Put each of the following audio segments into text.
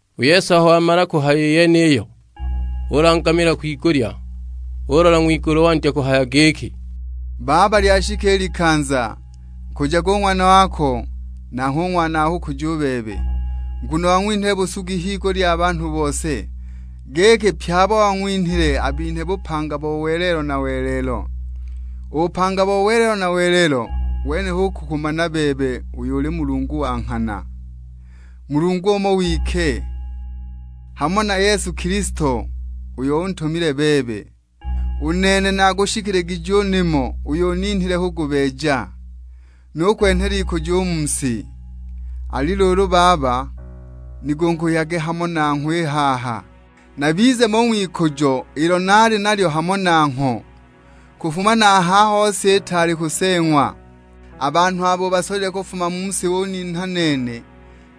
U Yesu aho wamala kuhaya i yeniyo, ulangamila kwigulya. Ulola ng'wigulu wandya kuhaya giki, "Baba lyashika i likanza; nkujage u Ng'wana wako, nanghwe u Ng'wana wako akukuje u bebe. Nguno wang'winhile busugi higulya ya banhu bose, giki pye abo wang'winhile abinhe bupanga bo welelo na welelo. U bupanga bo welelo na welelo wene kukumana bebe uyo uli Mulungu wa nghana; Mulungu umo wike, hamo na Yesu Kilisto, uyo untumile bebe. U nene naagushikiligije u nimo uyo uninhile kugubeeja, nukwenhela ikujo u mu si. Ali luulu Baba, nigunguhyage hamo nangho i haha, nabize mo u ng'wikujo ilo naali nalyo hamo nangho kufuma na a haho si itaali kuseeng'wa. A banhu abo ubasolile kufuma mu si uninha nene,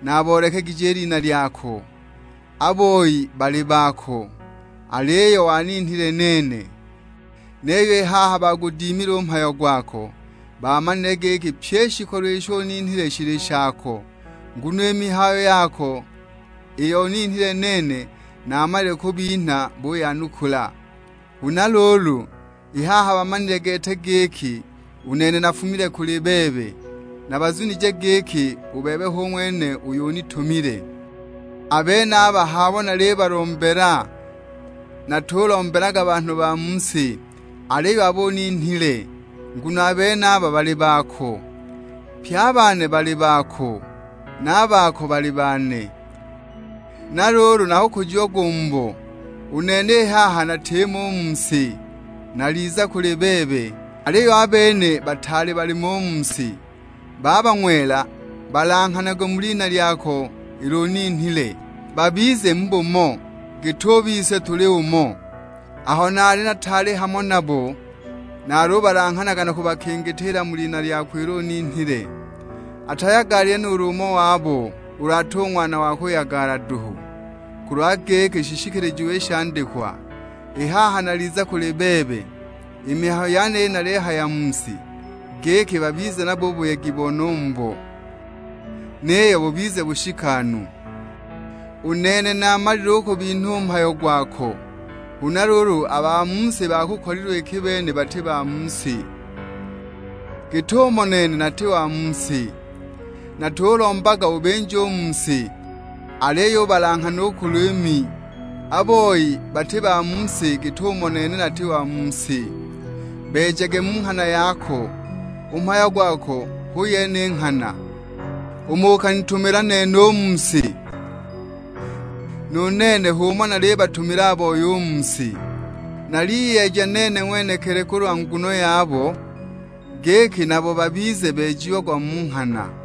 naaboolekegije i lina lyako. A boi baali bako, aliyo waninhile nene, niyo i haha bagudimile u mhayo gwako. Bamanile giki pyi i shikolo isho uninhile shili shako. Nguno i mihayo yako iyo uninhile nene, naamalile kubinha buyanukula. Huna luulu, i haha bamanile gete giki, u nene nafumile kuli bebe. Na bazunije giki u bebe hu ng'wene uyo unitumile. A benaba h'abo nalibalombela; natulombelaga banhu ba mu si, aliyo abo uninhile, nguno a benaba bali bako. Pye a bane bali bako, na a bako bali bane. Na luulu nakukujiagwa u mubo. U nene i haha natimo u mu si, naliza kuli bebe; aliyo a bene bataali balimo u mu si. Baba ng'wela, balanghanage mu lina lyako ilo uninhile, babize mu bumo, git'umo bise tuli umo. Aho naali nataali hamo nabo, nalubalanghanaga na kubakingitiila mu lina lyako ilo uninhile. Atayagalile nuulu umo wabo, ulu ati u ng'wana wa kuyagala duhu; kulwa giki shishikilijiwe i shandikwa. I haha naliza kuli bebe, i mihayo yeniyi naliyihaya mu si, giki babize nabo u buyegi bone u mubo; niyo bubize bushikanu. U nene naamalile u kubinha u mhayo gwako, huna luulu a ba mu si baabakolilwe iki a bene bati ba mu si, git'umo nene nati wa mu si. Natulombaga ubinje u mu si, aliyo ubalanghane u kuli Mi. A boi bati ba mu si git'umo nene nati wa mu si. Beejage mu nghana yako; u mhayo gwako hu yene i nghana. Umo ukanitumila nene u mu si, nu nene h'umo nalibatumila a boi u mu si. Naliyeeja nene ng'wenekili kulwa nguno yabo, giki nabo babize beejiagwa mu nghana."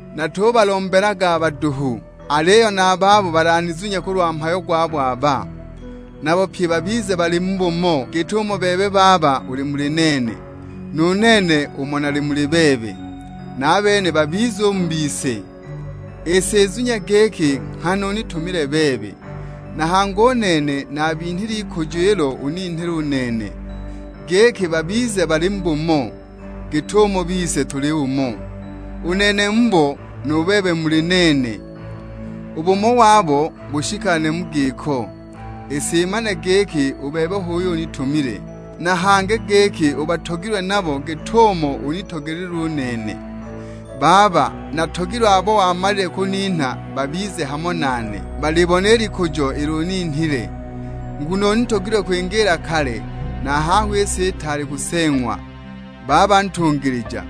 "Natubalombelaga aba duhu, aliyo na a babo balanizunye kulwa mhayo gwabo aba. Nabo pye babize bali mu bumo git'umo bebe Baba uli muli nene, nu nene umo nali muli bebe. Na a bene babize u mu bise; i si izunye giki nghana unitumile bebe. Na hangi u nene naabinhile i likujo ilo uninhile u nene, giki babize bali mu bumo, git'umo bise tuli umo. U nene mubo nu bebe muli nene; u bumo wabo bushikane mu giko, i si imane giki u bebe h'uyo unitumile, na hangi giki ubatogilwe nabo git'umo unitogelilwe u nene. Baba, natogilwe abo wamalile kuninha babize hamo nane. Balibone i likujo ilo uninhile, nguno unitogilwe kwingiila kale, na a haho si itaali kuseeng'wa. Baba ntungilija,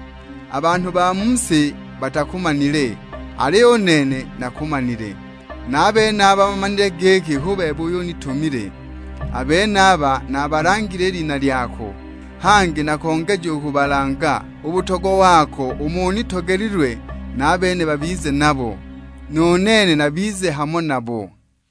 a banhu ba mu si batakumanile, aliyo u nene nakumanile; na a benaba bamanile giki hu bebe uyo unitumile. A benaba naabalangile i lina lyako, hangi nakongeja u kubalanga, u butogwa wako umo unitogelilwe na a bene babize nabo, nu nene nabize hamo nabo."